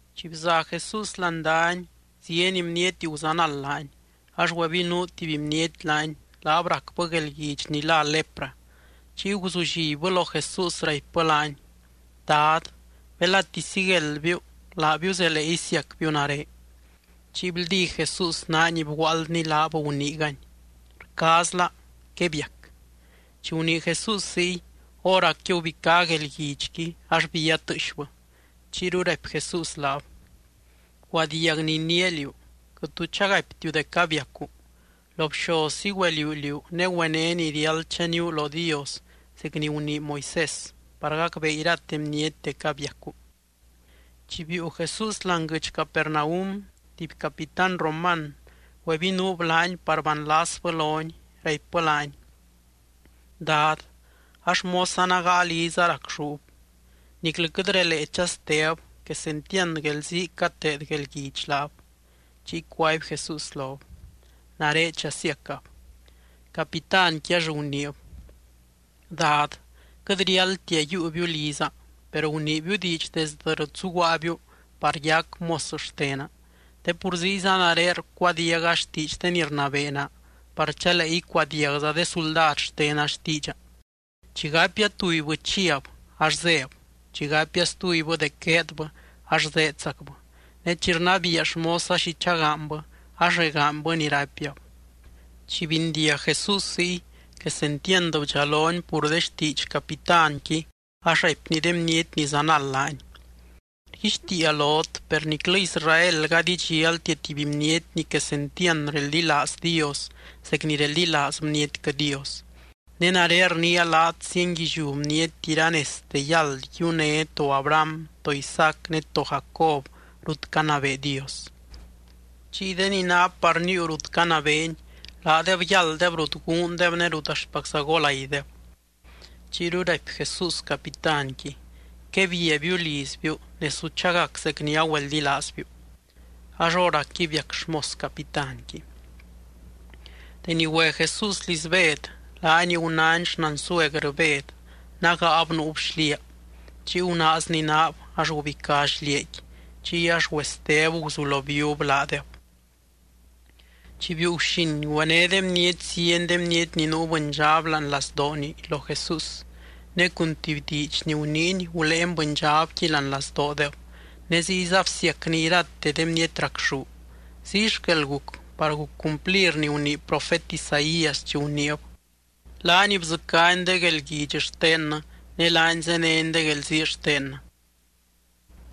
Chi bza Jesús láani dany, zieny bniety guzanald laany. Ax güebinuu tuby bniety laany, laab racbɨ guelguidx ni lá lepra, chiy guzullibbɨ lo Jesús raipbɨ laany: —Dad, belati sigueldbiu, laabiu zelee isiacbiu nare. Chiy bldí Jesús naany bguaaldny laab, guniigany: —Rcaazla. Quebiac. Chi gunii Jesús ziy, hóracqui gubicá guelguidxqui ax bía tɨɨxbɨ. Chiyru raipy Jesús laab: —Bcuadiag ni iniia liú. Quɨt tu chagaiptiu dec abiacu. Lo bxozzi güeliuu liú, ne güené ni riáld chaníu lo Dios zec ni gunii Moisés, par gacbee irate bniety dec abiacu. Chi biiu Jesús láani guɨdx Capernaum, tuby capitán roman güebinuub laany par banlasbɨ lony, raipbɨ laany: —Dad, a xmosa nágaa liza racxúb. Niclɨ quɨt relee chasteb, quesentiand guelzii cateed guelguidx laab. Chiy cuaby Jesús lob: —Nare chasiacab. Capitánqui ax guniib: —Dad, quɨt riáldtia yiiubiu liza, per guniibiu diidx desdɨ rut zuguaabiu par yac mos xtena. Te pur ziyza nare rcuadiaga xtiidx de ni rnabee naa par chalee icuadiagza de suldad xtena xtiidxa. Chi gapia tubybɨ chiab ax zéb. Chi gapia stubybɨ dec gueedbɨ ax zéedzacbɨ. Ne chi rnabiia xmosa xi chagaanybɨ, ax regaanybɨ ni raipiab. Chi bindiag Jesús ziy, quesentiand bdxalony pur de xtiidx capitánqui ax raipny de bniety ni zanald laany: —Rguixtiia lot, per niclɨ Israel gady idxialtia tuby bniety ni quesentiand reldilaaz Dios zec ni reldilaaz bnietquɨ Dios. Ne nare rniia laat zienguilliú bniety iranezte yáld yiuné to Abraham, to Isaac, ne to Jacob rut canabee Dios. Chiy de ni ná par níiu rut canabeeny, laadeb yálddeb rut guundeb ne rut axtpacza golaideb. Chiyru raipy Jesús capitánqui: —Quebiabiu lizbiu, ne su chagac zec ni agüeldilaazbiu. Ax hóracqui biac xmos capitánqui. Deni güe Jesús liz Bed, laany gunány xnansuergrɨ Bed, nágaab nuub xliaa. Chiy gunaazny naab, ax gubicá xliaaqui. Chiy ax güesteb guzulo bíub laadeb. Chi biiu guxin, güené de bniety zieny de bniety ni nuu bɨndxab láani lazdooni lo Jesús. Ne cun tuby diidx ni guniiny guléeny bɨndxabqui láani lazdoodeb, ne ziyza bsiacny irate de bniety racxú. Ziy xquel guc, par guc cumplir ni gunii profet Isaías chi guniib: “Laany bdzɨcány de guelguidx xtennɨ, ne laany zéneny de guelzii xtennɨ.”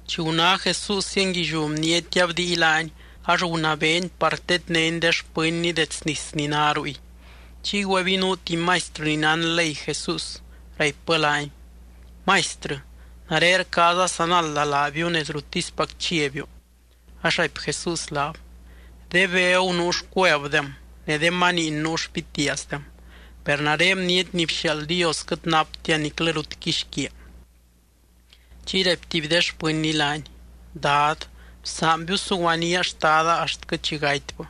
Chi guná Jesús zienguilliú bniety abdii laany, ax gunabeeny par tednény de xpɨnny dets nis ni ná ruy. Chiy güebinuu tuby maistrɨ ni nán ley Jesús, raipbɨ laany: —Maistrɨ, nare rcaaza sanalda laabiu nez ruttispac chiabiu. Ax raipy Jesús laab: —De begu nuu xcuevdem, ne de maniin nuu xpitiaazdem. Per nare Bniety ni bxiaald Dios quɨt naptia niclɨ rut quixquiaa. Chiy raipy tuby de xpɨnny laany: —Dad, bsaanbiu suguanía xtada axtquɨ chi gatybɨ.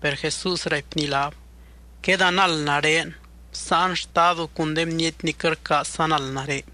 Per Jesús raipny laab: —Quedanald nare, bsáan xtadu cun de bniety ni quɨt rcaaz sanald nare.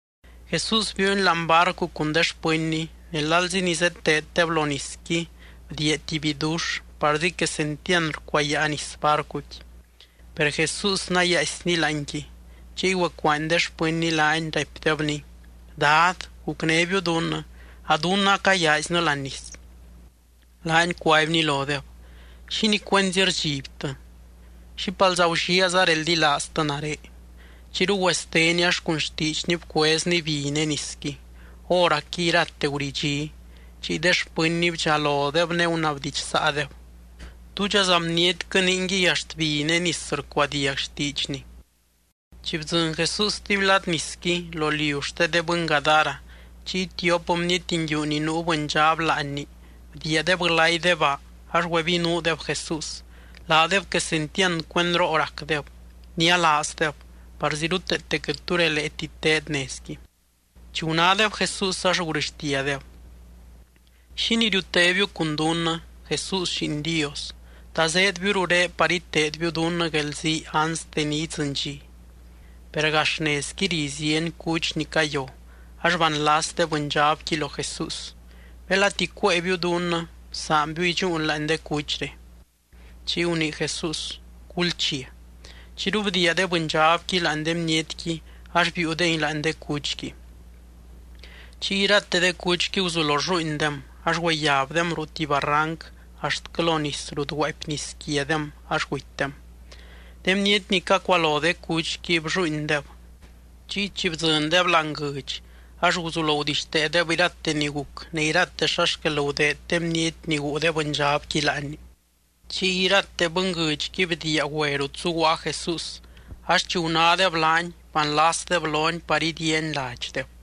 Jesús biiuny láani barcu cun de xpɨnny, ne lalzi ni zeteeddeb lo nisqui bdiia tuby bidux parzi quesentiand rcuayaa nis barcuqui. Per Jesús nayaaisny láanqui. Chiy güecuaany de xpɨnny laany, raipdebny: —¡Dad, gucnébiu dunnɨ! ¡A dunnɨ acayaaiznɨ láani nis! Laany cuaibny lodeb: —¿Xínii cuenzi rdxibtɨ? ¡Xípalza gulliaaza reldilaaztɨ nare! Chiyru güesteny ax cun xtiidxny bcuezny bi ne nisqui. Hóracqui irate guridxí. Chiy de xpɨnny bdxalodeb ne gunabdidxsaadeb: —¿Túdxaza bnietquɨ, ningui axt bi ne nis rcuadiag xtiidxny? Chi bdzɨny Jesús stuby lad nisqui, lo liu xte de bɨny Gadara, chiy tiop bniety nguiu ni nuu bɨndxab láanni bdiiadeb glay de baa ax güebinuudeb Jesús. Laadeb quesentiand cuendroo racdeb, nialaazdeb, parzi ruteete quɨt tu releeti teed nezqui. Chi gunádeb Jesús ax gurɨxtiadeb: —¿Xínii riutébiu cun dunnɨ, Jesús, Lliin Dios? ¿Ta zéedbiu rurén par iteedbiu dunnɨ guelzii anste ni idzɨny dxi? Per gax nezqui ri zieny cuch ni cayo, ax banlas de bɨndxabqui lo Jesús: —Belati cuéebiu dunnɨ, bsaanbiu idxúun láani de cuchre. Chiy gunii Jesús: —Gulchia. Chiyru bdiia de bɨndxabqui láani de bnietqui ax biiudengui láani de cuchqui. Chiy irate de cuchqui guzulo rlluuindem ax güeyabdem ruu tuby barranc axtquɨ lo nis rut guaapy nis quiadem ax gutydem. De bniety ni cacualo de cuchqui, blluuindeb. Chiy chi bdzɨndeb láani guɨdx ax guzulo gudixteedeb irate ni guc ne irate xa xquel gudeed de bniety ni guu de bɨndxabqui láanni. Chiy irate bɨnguɨdxqui bdiia güe rut zuguaa Jesús, ax chi gunádeb laany, banlasdeb lony par idiiany ladxdeb.